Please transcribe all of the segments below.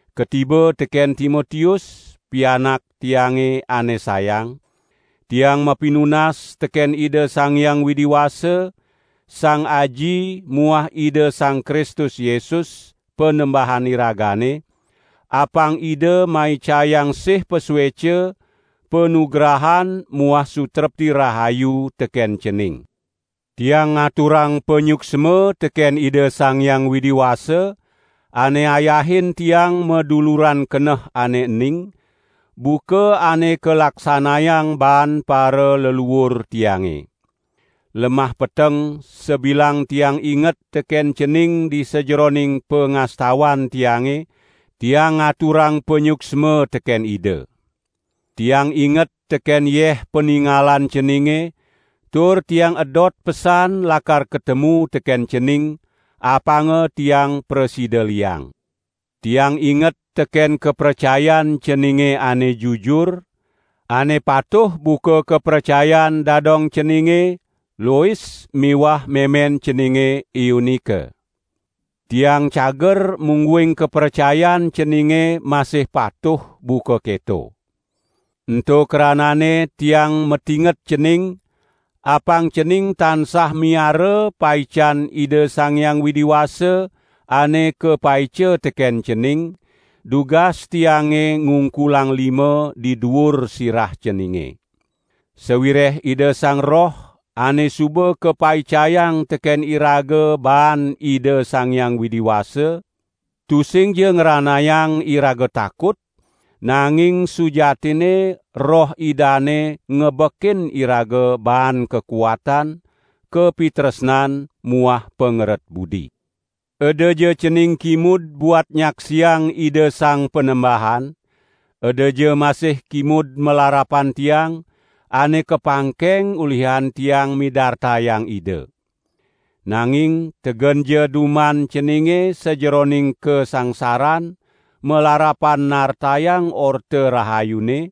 Katiba teken Timotius, pianak tiange ane sayang: Tiang mapinunas teken Ida Sang Hyang Widi Wasa, Sang Aji muah Ida Sang Kristus Yesus, Panembahan iragane, apang Ida maicayang sih pasueca, panugrahan muah sutrepti rahayu teken cening. Tiang ngaturang panyuksma teken Ida Sang Hyang Widi Wasa, ane ayahin tiang maduluran keneh ane ening, buka ane kalaksanayang baan paraleluur tiange. Lemah peteng, sabilang tiang inget teken cening di sajeroning pangastawan tiange, tiang ngaturang panyuksma teken Ida. Tiang inget teken yeh paningalan ceninge, tur tiang edot pesan lakar katemu teken cening, apanga tiang prasida liang. Tiang inget teken kapracayan ceninge ane jujur, ane patuh buka kapracayan dadong ceninge, Lois muah memen ceninge Eunike. Tiang cager mungguing kapracayan ceninge masih patuh buka keto. Ento krananne tiang matinget cening, apang cening tansah miara paican Ida Sang Hyang Widi Wasa ane kapaica teken cening, dugas tiange ngungkulang lima di duur sirah ceninge. Sawireh Ida Sang Roh, ane suba kapaicayang teken iraga baan Ida Sang Hyang Widi Wasa, tusingja ngranayang iraga takut, nanging sujatinne Roh Idane ngebekin iraga baan kakuatan, kapitresnan muah pangeret budi. Edaja cening kimud buat nyaksiang Ida Sang Panembahan; edaja masih kimud malarapan tiang, ane kapangkeng ulihan tiang midartayang Ida. Nanging tegenja duman ceninge sajeroning kasangsaran malarapan nartayang Orta Rahayune,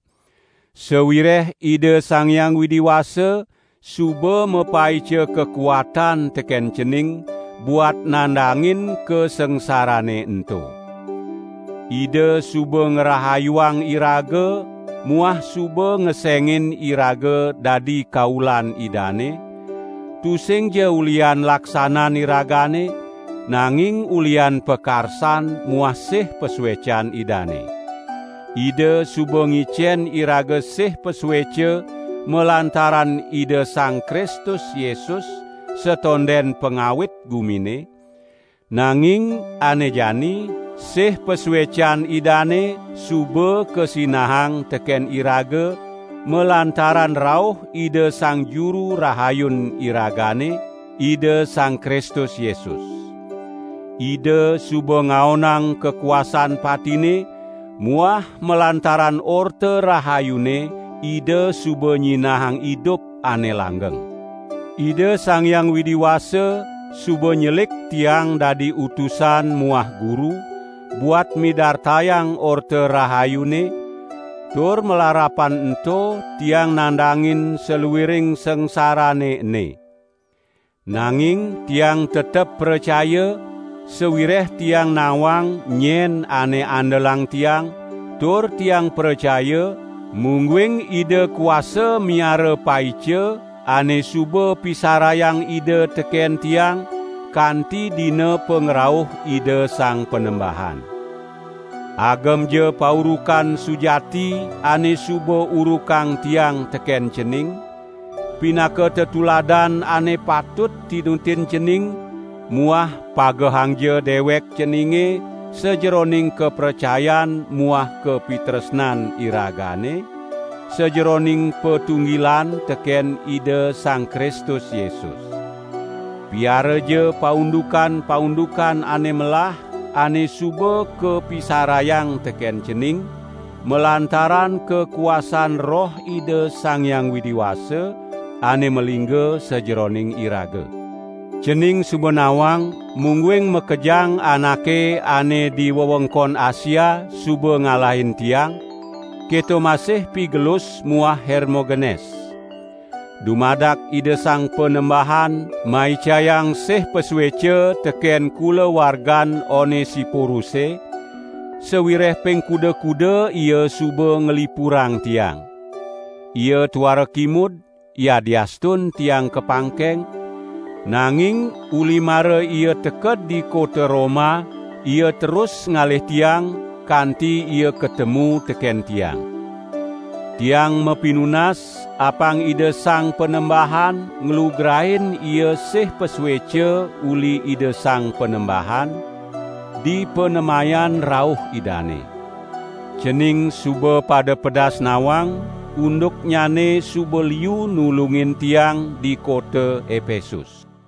sawireh Ida Sang Hyang Widi Wasa suba mapaica kakuatan teken cening buat nandangin kasangsarane ento. Ida suba ngrahayuang iraga muah suba ngesengin iraga dadi kaulan Idane, tusingja ulihan laksanan iragane, nanging ulihan pakarsan muah sih pasuecan Idane. Ida suba ngicen iraga sih pasueca malantaran Ida Sang Kristus Yesus satonden pangawit gumine, nanging ane jani sih pasuecan Idane suba kasinahang teken iraga malantaran rauh Ida Sang Juru Rahayun iragane, Ida Sang Kristus Yesus. Ida suba ngaonang kakuasan patine muah malantaran Orta Rahayune Ida suba nyinahang idup ane langgeng. Ida Sang Hyang Widi Wasa suba nyelik tiang dadi utusan muah guru, buat midartayang Orta Rahayune, tur malarapan ento tiang nandangin saluiring sangsarane ene. Nanging tiang tetep pracaya, sawireh tiang nawang nyen ane andelang tiang, tur tiang pracaya, mungguing Ida kuasa miara paica ane suba pisarayang Ida teken tiang kanti dina pangrauh Ida Sang Panembahan. Agemja paurukan sujati ane suba urukang tiang teken cening, pinaka tetuladan ane patut tinutin cening muah pagehangja dewek ceninge sajeroning kapracayan muah kapitresnan iragane, sajeroning patunggilan teken Ida Sang Kristus Yesus. Piaraja paundukan-paundukan ane melah ane suba kapisarayang teken cening, malantaran kakuasan Roh Ida Sang Hyang Widi Wasa, ane malingga sajeroning iraga. Cening suba nawang, mungguing makejang anake ane di wewengkon Asia suba ngalahin tiang, keto masih Pigelus muah Hermogenes. Dumadak Ida Sang Panembahan maicayang sih pasueca teken kulawargan Onesiporuse, sawireh ping kuda-kuda ia suba nglipurang tiang. Ia tuara kimud, yadiastun tiang kapangkeng, nanging uli mara ia teked di kota Roma ia terus ngalih tiang, kanti ia katemu teken tiang. Tiang mapinunas apang Ida Sang Panembahan nglugrain ia sih pasueca uli Ida Sang Panembahan, dipanemayan rauh Idane. Cening suba pada pedas nawang, unduknyane suba liu nulungin tiang di kota Epesus.